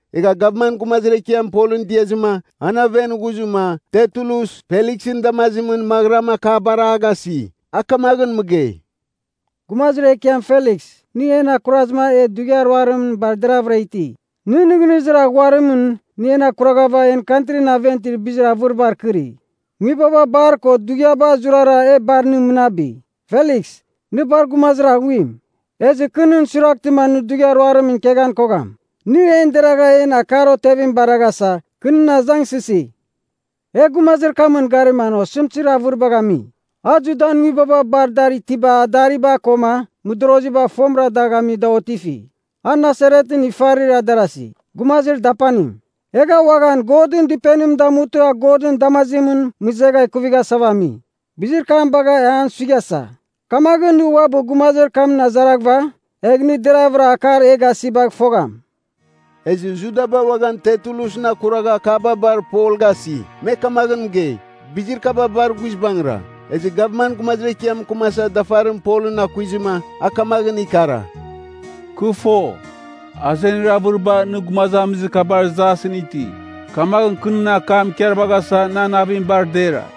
Egha gavman gumazir ekiam Polɨn diazɨma an aven ghuzɨma, Tertulus, Feliksɨn damazimɨn maghɨram akabar a gasi. A kamaghɨn mɨgei, “Gumazir Ekiam Feliks, nɨ en akurazɨma e dughiar ruarimɨn bar deraghvɨra iti. Nɨn nɨghnɨzir aghuarimɨn nɨ en akurvagha en kantrin aven itir bizir avɨribar akɨri. Nguibaba bar ko dughiaba zurara e bar nɨ mɨnabi: Feliks, nɨ bar gumazir aghuim. “Ezɨ kɨ nɨn suiraghtɨma nɨ dughiar ruarimɨn ikeghan kogham, nɨ en deragh en akar otevim baraghasa, kɨ nɨn azangsɨsi. “E gumazir kamɨn garima an osɨmtɨzir avɨribagh ami. A Judan nguibaba bar dar itiba adariba koma mɨdoroziba fomɨra dagh ami da otifi, a Nasaretɨn ifarir darasi, gumazir dapanim. Egha uaghan Godɨn Dɨpenim damutɨ a Godɨn damazimɨn mɨzegha kuvighasava ami. Bizir kam bagha e an suighasa. Kamaghɨn nɨ uabɨ gumazir kamɨn azaraghɨva, egh nɨ deraghvɨra akar e a gasibagh fogham.” Ezɨ Judaba uaghan Tertulusɨn akuragha akaba bar Pol gasi. Me kamaghɨn mɨgei, bizir kaba bar guizbangɨra. Ezɨ gavman gumazir ekiam mɨkɨmasa dafarim Polɨn akuizɨma, a kamaghɨn ikara, “Kɨ fo, azenir avɨriba nɨ gumazamizir kabar jasɨn iti. Kamaghɨn kɨ nɨn akam ikarvaghasa nan navim bar dera.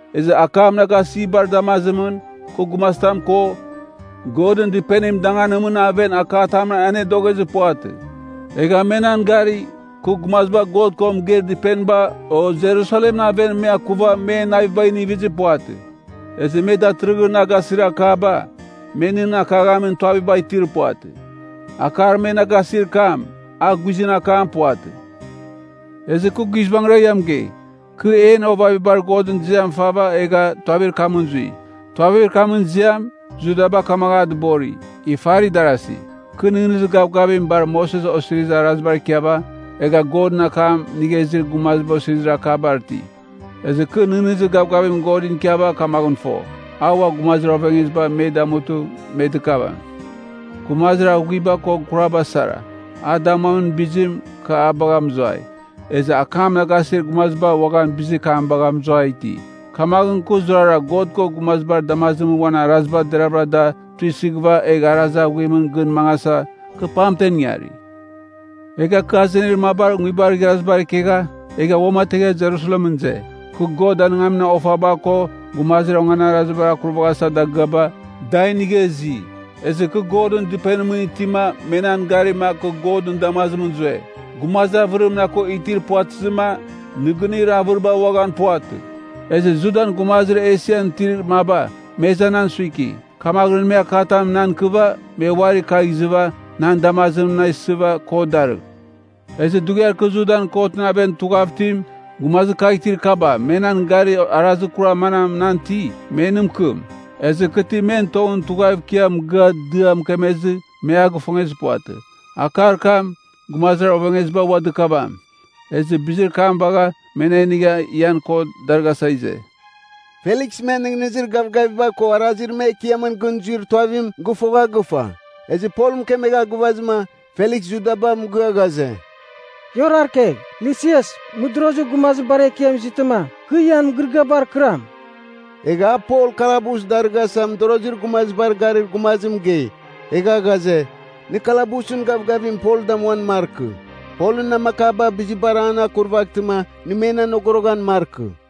Ezɨ akam na gasibar damazimɨn, kɨ gumazitam ko, Godɨn Dɨpenim danganimɨn aven akatamɨn anedoghezir puvatɨ. Egha me nan gari, kɨ gumaziba God ko mɨgeir dɨpeniba o Jerusalemɨn aven me akuva men navibagh inivizir puvatɨ. Ezɨ me datɨrɨghɨn na gasir akaba, me nɨn akaghamin tuavitam itir puvatɨ. Akar me na gasir kam, a guizɨn akam puvatɨ. “Ezɨ kɨ guizbangɨra mɨgei, kɨ en ovavibar Godɨn ziam fava egha Tuavir kamɨn zui. Tuavir kamɨn ziam Judaba kamaghɨn a dɨbori, ifarir darasi. Kɨ nɨghnɨzir gavgavim bar Moses Osirizir Araziba ikiava, egha Godɨn akam inigha izir gumaziba osirizir akabar iti. Ezɨ kɨ nɨghnɨzir gavgavim Godɨn ikiava kamaghɨn fo, a ua gumazir ovengeziba me damutɨma me dɨkavam. Gumazir aghuiba ko kuraba sara. A damuamin bizim, kɨ a bagha mɨzuai. Ezɨ akam na gasir gumaziba uaghan bizir kam bagha mɨzuai iti. Kamaghɨn kɨ zurara God ko gumazibar damazimɨn uan araziba deravɨra da tuisɨghɨva egh arazir aghuimɨn gɨn mangasa, kɨ pamtem ingari. “Egha kɨ azenir mabar nguibar igharazibar ikegha, egha uamategha Jerusalemɨn ize. Kɨ God danɨngamin ofaba ko gumazir onganarazibar akurvaghasa dagɨaba, da inigha izi. Ezɨ kɨ Godɨn Dɨpenimɨn itima me nan garima kɨ Godɨn damazimɨn zue. Gumazir avɨrim na ko itir puvatɨzɨma, nɨgɨnir avɨriba uaghan puvatɨ. Ezɨ Judan gumazir Esian itir maba, me iza nan suiki, kamaghɨn me akatam nan ikɨva, me uari kagh izɨva, nɨn damazimɨn na isɨva kot darɨgh. Ezɨ dughiar kɨ Judan kotɨn aven tughav itim, gumazir kagh itir kaba me nan gari arazir kurar manam nan iti, me nɨ mɨkɨm. Ezɨ kɨ ti men tongɨn tughav ikia mɨgɨa dɨa mɨkemezɨ me a gifongezɨ puvatɨ. Akar kam, ‘gumazir ovengeziba ua dɨkavam, ezɨ bizir kam bagha me na inigha ian kot darɨghasa ize.’” Feliks men nɨghnɨzir gavgaviba ko arazir me Ekiamɨn gɨn zuir Tuavim gɨfogha gɨfa. Ezɨ Pol mɨkemegha gɨvazɨma, Feliks Judaba mɨgɨa ghaze, “Ia orarkegh. Lisias, mɨdorozir gumazibar ekiam izɨtɨma, kɨ ian mɨgɨrɨgɨabar kɨram.” Egha a Pol kalabus darɨghasa mɨdorozir gumazibar garir gumazim mɨgei, egha ghaze, nɨ kalabusɨn gavgavim Pol damuan markɨ. Polɨn namakaba bizibar an akurvatɨma nɨ men anogoroghan markɨ.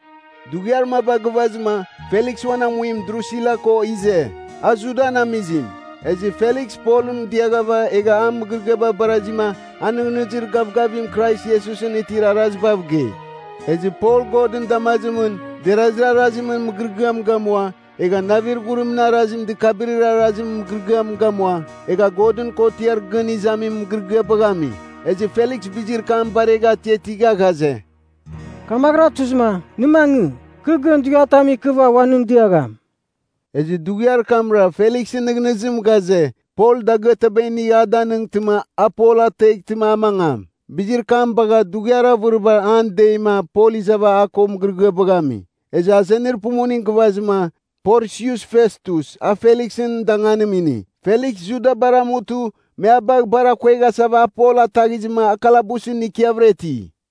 Dughiar maba gɨvazɨma, Feliks uan amuim Drusila ko ize. A Judan amizim. Ezɨ Feliks Polɨn diaghava egha a mɨgɨrɨgɨaba barazima a nɨghnɨzir gavgavim Krais Iesusɨn itir arazibav gei. Ezɨ Pol Godɨn damazimɨn derazir arazimɨn mɨgɨrɨgɨam gamua egha navir ghurimɨn arazim dɨkabɨrir arazimɨn mɨgɨrɨgɨam gamua, egha Godɨn Kotiar Gɨn Izamin mɨgɨrɨgɨabagh ami. Ezɨ Feliks bizir kam baregha atiatigha ghaze, “Kamaghɨra tuzɨma, nɨ mangɨ. Kɨ gɨn dughiatam ikɨva ua nɨn diagham.” Ezɨ dughiar kamra Feliksɨn nɨghnɨzim ghaze, Pol dagɨataba inigh a danɨngtɨma a Pol ateghtɨma a mangam. Bizir kam bagha dughiar avɨribar an deima Pol izava a ko mɨgɨrɨgɨaba ami. Ezɨ azenir pumuning gɨvazɨma, Porsius Festus a Feliksɨn danganim ini. Feliks Judabar amutɨ me a bagh bar akueghasava a Pol ataghizɨma a kalabusɨn ikiavɨra iti.